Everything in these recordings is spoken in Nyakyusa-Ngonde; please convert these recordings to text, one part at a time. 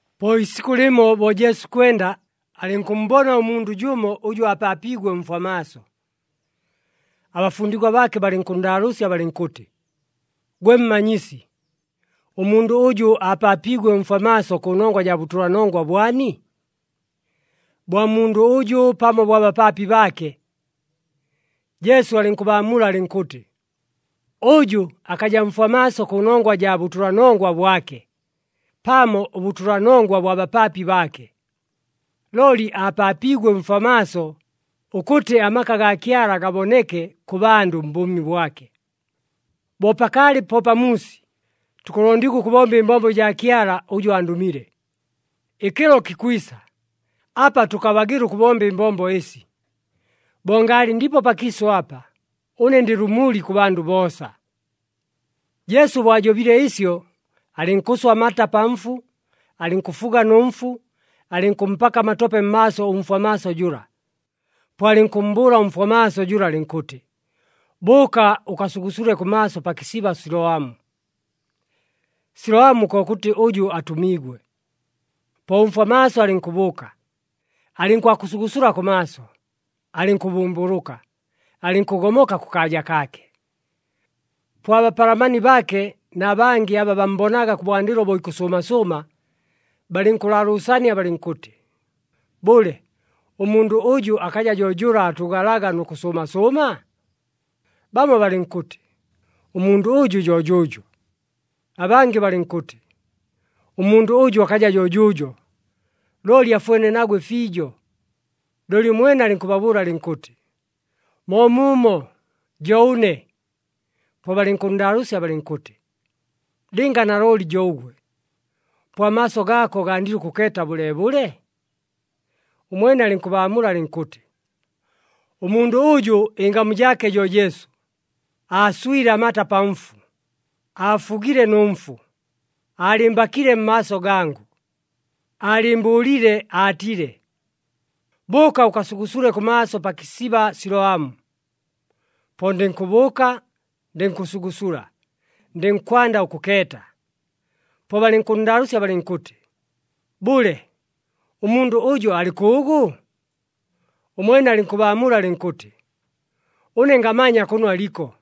Po iisikʉ lɨmo bo Jesu ikwenda, alɨnkʉmmbona ʉmundʉ jʉmo ʉjʉ aapaapiigwe mfwa maaso. Abafundigwa baake balɨnkʉnndaalʉʉsya balɨnkʉtɨ, “Gwe Mmanyisi, ʉmundʉ ʉjʉ aapaapiigwe mfwa maaso kʉnongwa jaa bʉtʉlanongwa bwani? Bwa mundʉ ʉjʉ pamo bwa bapaapi baake?” Jesu alɨnkʉbaamula alɨnkʉtɨ, “Ʉjʉ akaja mfwa maaso kʉnongwa jaa bʉtʉlanongwa bwake, pamo ʉbʉtʉlanongwa bwa bapaapi baake. Looli aapaapiigwe mfwa maaso, ʉkʉtɨ amaka agaa Kyala gaboneke kʉ bandʉ mbʉʉmi bwake. Bo pakaalɨ po pamuusi, tukʉlondigwa ʉkʉbomba ɨmbombo ɨjaa Kyala ʉjʉ andʉmile. Ɨkɨlo kikwisa, apa tʉkabagɨla ʉkʉbomba ɨmbombo ɨsi. Bo ngaalɨ ndipo pakiisʉ apa, ʉne ndɨ lʉmuli kʉ bandʉ boosa.” Jesu bo ajobile ɨsyo, alɨnkʉswa amata pa mfu, alɨnkʉfuga nʉ mfu, alɨnkʉmpaka amatope mmaaso ʉmfwa maaso jʉla. Po alɨnkʉmmbʉʉla ʉmfwa maaso jʉla alɨnkʉtɨ, “Bʉʉka ʉkasugusule kʉmaaso pa kɨsiba Siloamu” (Siloamu kokʉtɨ ʉjʉ atʉmiigwe). Po ʉmfwa maaso alɨnkʉbʉʉka, alɨnkwakʉsugusula kʉmaaso, alɨnkʉbʉmbʉlʉka, alɨnkʉgomoka kʉkaaja kaake. Po abapalamani baake na bangɨ aba bammbonaga kʉbwandɨlo bo ikʉsʉʉma sʉʉma, balɨnkʉlaalʉʉsania balɨnkʉtɨ, “Bʉle, ʉmundʉ ʉjʉ akaja jo jʉla aatʉʉgalaga nʉ kʉsʉʉma sʉʉma?” Bamo balɨnkʉtɨ, “Ʉmundʉ ʉjʉ jo jʉʉjo.” Abangɨ balɨnkʉtɨ, “Ʉmundʉ ʉjʉ akaja jo jʉʉjo, looli afwene nagwe fiijo.” Looli ʉmwene alɨnkʉbabʉʉla alɨnkʉtɨ, “Moomuumo, jo ʉne.” Po balɨnkʉnndaalʉʉsya balɨnkʉtɨ, “Lɨnga nalooli jo ʉgwe, po amaaso gaako gandile ʉkʉkeeta bʉleebʉle?” Ʉmwene alɨnkʉbaamula alɨnkʉtɨ, “Ʉmundʉ ʉjʉ ɨngamu jaake jo Jesu, aaswile amata pa mfu, aafugile nʉ mfu, aalɨmbakile mmaaso gangʉ, aalɨɨmbʉʉlile aatile, ‘Bʉʉka ʉkasugusule kʉmaaso pa kɨsiba Siloamu.’ Po ndɨnkʉbʉʉka, ndɨnkʉsugusula, ndɨnkwanda ʉkʉkeeta.” Po balɨnkʉnndaalʉʉsya balɨnkʉtɨ, “Bʉle, ʉmundʉ ʉjo alɨ kʉʉgʉ?” Ʉmwene alɨnkʉbaamula alɨnkʉtɨ, “Ʉne ngamanya kʉno aliko.”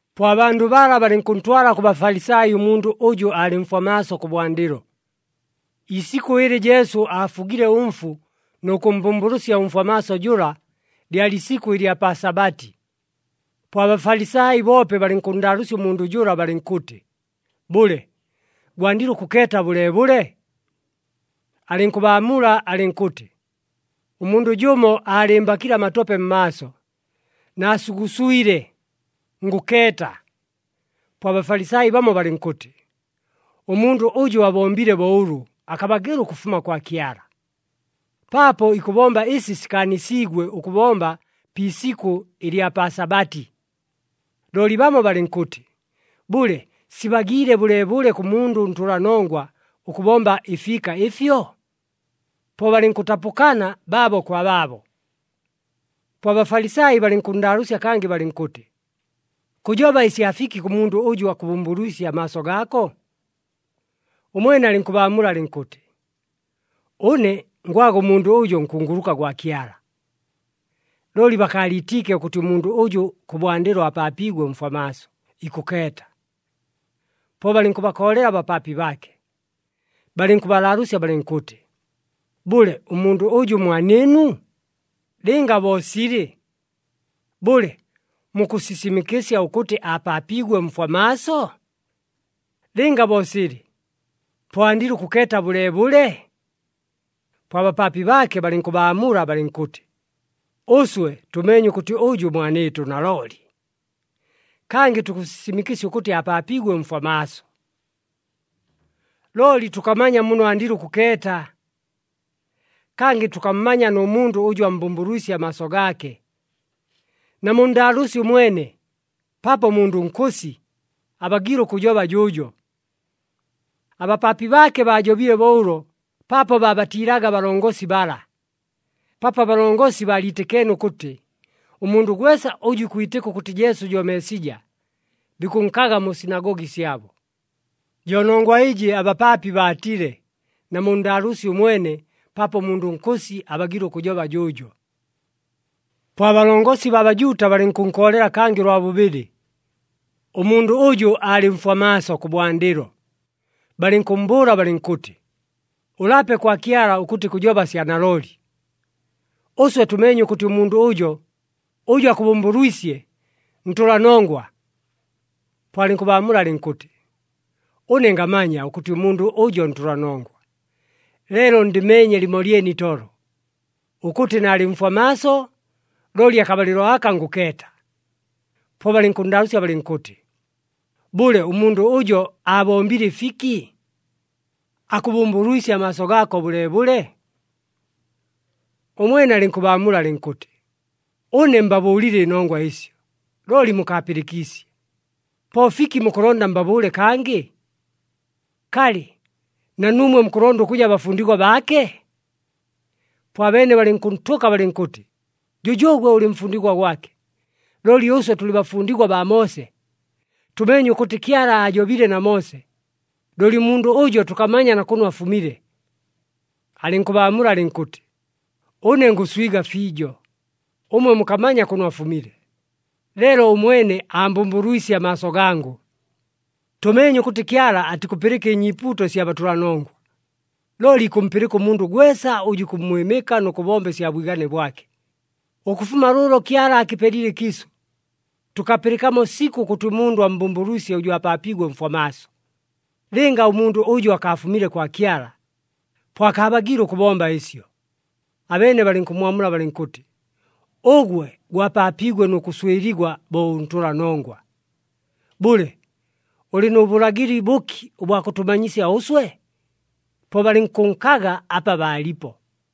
Po abandʉ bala balɨnkʉntwala kʉ Bafalisai ʉmundʉ ʉjʉ aalɨ mfwa maaso kʉbwandɨlo. Iisikʉ ɨlɨ Jesu aafugile ʉmfu nʉ kʉmmbʉmbʉlʉsya ʉmfwa maaso jʉla, lyalɨ isikʉ ɨlya pa Sabati. Po aBafalisai boope balɨnkʉnndaalʉʉsya ʉmundʉ jʉla balɨnkʉtɨ, “Bʉle, gwandile ʉkʉkeeta bʉleebʉle?” Alɨnkʉbaamula alɨnkʉtɨ, “Ʉmundʉ jʉmo aalɨmbakile amatope mmaaso, naasuguswile, ngʉkeeta.” Po aBafalisai bamo balɨnkʉtɨ, “Ʉmundʉ ʉjʉ abombile bo ʉlʉ akabagɨla ʉkʉfuma kwa Kyala, paapo ikʉbomba ɨsi sikaanisiigwe ʉkʉbomba pi isikʉ ɨlya pa Sabati.” Looli bamo balɨnkʉtɨ, “Bʉle, sibagiile bʉleebʉle kʉ mundʉ ʉntʉlanongwa ʉkʉbomba ɨfiika ɨfyo?” Po balɨnkʉtapʉkana baabo kwa baabo. Po aBafalisai balɨnkʉnndaalʉʉsya kangɨ balɨnkʉtɨ, “Kʉjoba ɨsya fiki kʉ mundʉ ʉjʉ akʉbʉmbʉlwisye amaaso gaako?” Ʉmwene alɨnkʉbaamula alɨnkʉtɨ, “Ʉne ngwaga ʉmundʉ ʉjo nkunguluka gwa Kyala.” Looli bakaaliitiike ʉkʉtɨ ʉmundʉ ʉjʉ kʉbwandɨlo aapaapiigwe mfwa maaso, ikʉkeeta. Po balɨnkʉbakoolela abapaapi baake. Balɨnkʉbalaalʉʉsya balɨnkʉtɨ, “Bʉle, ʉmundʉ ʉjʉ mwanɨɨnu? Lɨnga bo silɨ, bʉle, mukʉsisimɨkɨsya ʉkʉtɨ aapaapiigwe mfwa maaso? Lɨnga bo silɨ, po andile ʉkʉkeeta bʉleebʉle?” Po abapaapi baake balɨnkʉbaamula balɨnkʉtɨ, “Ʉswe tʉmeenye ʉkʉtɨ ʉjʉ mwanɨɨtʉ nalooli, kangɨ tukʉsisimɨkɨsya ʉkʉtɨ aapaapiigwe mfwa maaso. Looli tʉkamanya muno andiile ʉkʉkeeta, kangɨ tʉkammanya nʉ mundʉ ʉjʉ ammbʉmbʉlwisye amaaso gaake. Namunndaalʉʉsye ʉmwene, paapo mundʉ nkʉsi, abagiile ʉkʉjoba jʉʉjo.” Abapaapi baake baajobile bo ʉlo paapo baabatiilaga abalongosi bala, paapo abalongosi baaliitɨkeene ʉkʉtɨ ʉmundʉ gwesa ʉjʉ ikwitɨka ʉkʉtɨ Jesu jo Meesija, bikʉnkaga mu sinagogi syabo. Jo nongwa ɨjɨ abapaapi baatile, “Namunndaalʉʉsye ʉmwene, paapo mundʉ nkʉsi, abagiile ʉkʉjoba jʉʉjo.” Po abalongosi baa Bajuuta balɨnkʉnkoolela kangɨ ʉlwa bʉbɨlɨ, ʉmundʉ ʉjʉ aalɨ mfwa maaso kʉbwandɨlo, balɨnkʉmmbʉʉla balɨnkʉtɨ, “Ʉlape kwa Kyala ʉkʉtɨ kʉjoba sya nalooli! Ʉswe tʉmeenye ʉkʉtɨ ʉmundʉ ʉjo, ʉjʉ akʉbʉmbʉlwisye, ntʉlanongwa.” Po alɨnkʉbaamula alɨnkʉtɨ, “Ʉne ngamanya ʉkʉtɨ ʉmundʉ ʉjo ntʉlanongwa, leelo ndɨmeenye lɨmolyene itolo, ʉkʉtɨ naalɨ mfwa maaso, looli akabalɨlo aka ngʉkeeta.” Po balɨnkʉnndaalʉʉsya balɨnkʉtɨ, “Bʉle, ʉmundʉ ʉjo aabombile ɨfiki? Akʉbʉmbʉlwisye amaaso gaako bʉleebʉle?” Ʉmwene alɨnkʉbaamula alɨnkʉtɨ, “Ʉne mbabʉʉlile ɨnongwa ɨsyo, looli mukaapɨlɨkiisye. Po fiki mukʉlonda mbabʉʉle kangɨ? Kalɨ, na nuumwe mukʉlonda ʉkʉja bafundigwa baake?” Po abeene balɨnkʉntʉka balɨnkʉtɨ, “Jʉjʉʉgwe ʉlɨ mfundigwa gwake! Looli ʉswe tʉlɨ bafundigwa baa Moose. Tʉmeenye ʉkʉtɨ Kyala aajobile na Moose, looli ʉmundʉ ʉjo tʉkamanya na kʉno afumile.” Alɨnkʉbaamula alɨnkʉtɨ, “Ʉne ngʉswiga fiijo! Ʉmwe mukammanya kʉno afumile, leelo ʉmwene aambʉmbʉlwisye amaaso gangʉ! Tʉmeenye ʉkʉtɨ Kyala atikʉpɨlɨka ɨnyiipuuto ɨsya batʉlanongwa, looli ikʉmpɨlɨka ʉmundʉ gwesa ʉjʉ ikʉmmwɨmɨka nʉ kʉbomba ɨsya bwigane bwake. Ʉkʉfuma lʉʉlo Kyala aakɨpelile ɨkiisʉ, tʉkapɨlɨkamo sikʉ ʉkʉtɨ ʉmundʉ ammbʉmbʉlwisye ʉjʉ aapaapiigwe mfwa maaso. Lɨnga ʉmundʉ ʉjo akaafumile kwa Kyala, po akaabagiile ʉkʉbomba ɨsyo.” Abeene balɨnkʉmmwamula balɨnkʉtɨ, “Ʉgwe gwapaapiigwe nʉ kʉswɨligwa bo ʉntʉlanongwa. Bʉle, ʉlɨ nʉ bʉlagɨli bʉki ʉbwa kʉtʉmanyisya ʉswe?” Po balɨnkʉnkaga apa baalipo.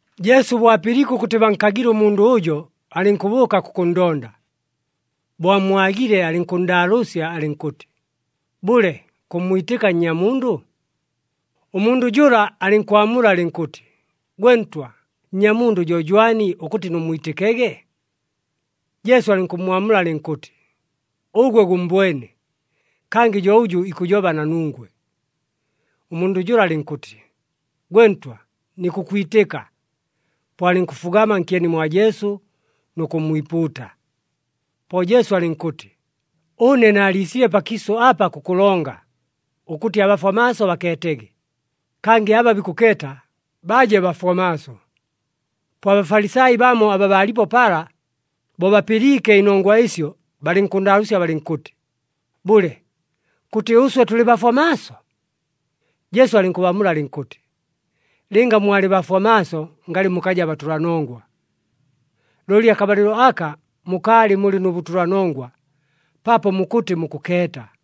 Jesu bo apɨliike ʉkʉtɨ bankagile ʉmundʉ ʉjo, alɨnkʉbʉʉka kʉkʉnndonda. Bo ammwagile, alɨnkʉnndaalʉʉsya alɨnkʉtɨ, “Bʉle, kʉmmwitɨka Nnyamundʉ?” Ʉmundʉ jʉla alɨnkwamula alɨnkʉtɨ, “Gwe Ntwa, Nnyamundʉ jo jwani ʉkʉtɨ nʉmmwitɨkege?” Jesu alɨnkʉmmwamula alɨnkʉtɨ, “Ʉgwe gʉmmbwene, kangɨ jo ʉjʉ ikʉjoba na nungwe.” Ʉmundʉ jʉla alɨnkʉtɨ, “Gwe Ntwa, nikʉkwitɨka.” Po alɨnkʉfugama nkyeni mwa Jesu nʉ kʉmmwipuuta. Po Jesu alɨnkʉtɨ, “Ʉne naaliisile pakiisʉ apa kʉkʉlonga, ʉkʉtɨ abafwa maaso bakeetege, kangɨ aba bikʉkeeta, baje bafwa maaso.” Po aBafalisai bamo aba baalipo pala, bo bapɨliike ɨnongwa ɨsyo, balɨnkʉnndaalʉʉsya balɨnkʉtɨ, “Bʉle, kʉtɨ ʉswe tʉlɨ bafwa maaso?” Jesu alɨnkʉbaamula alɨnkʉtɨ, “Lɨnga mwalɨ bafwa maaso ngalɨ mukaja batʉlanongwa. Looli akabalɨlo aka mukaalɨ mulɨ nʉ bʉtʉlanongwa, paapo mukʉtɨ mukʉkeeta.”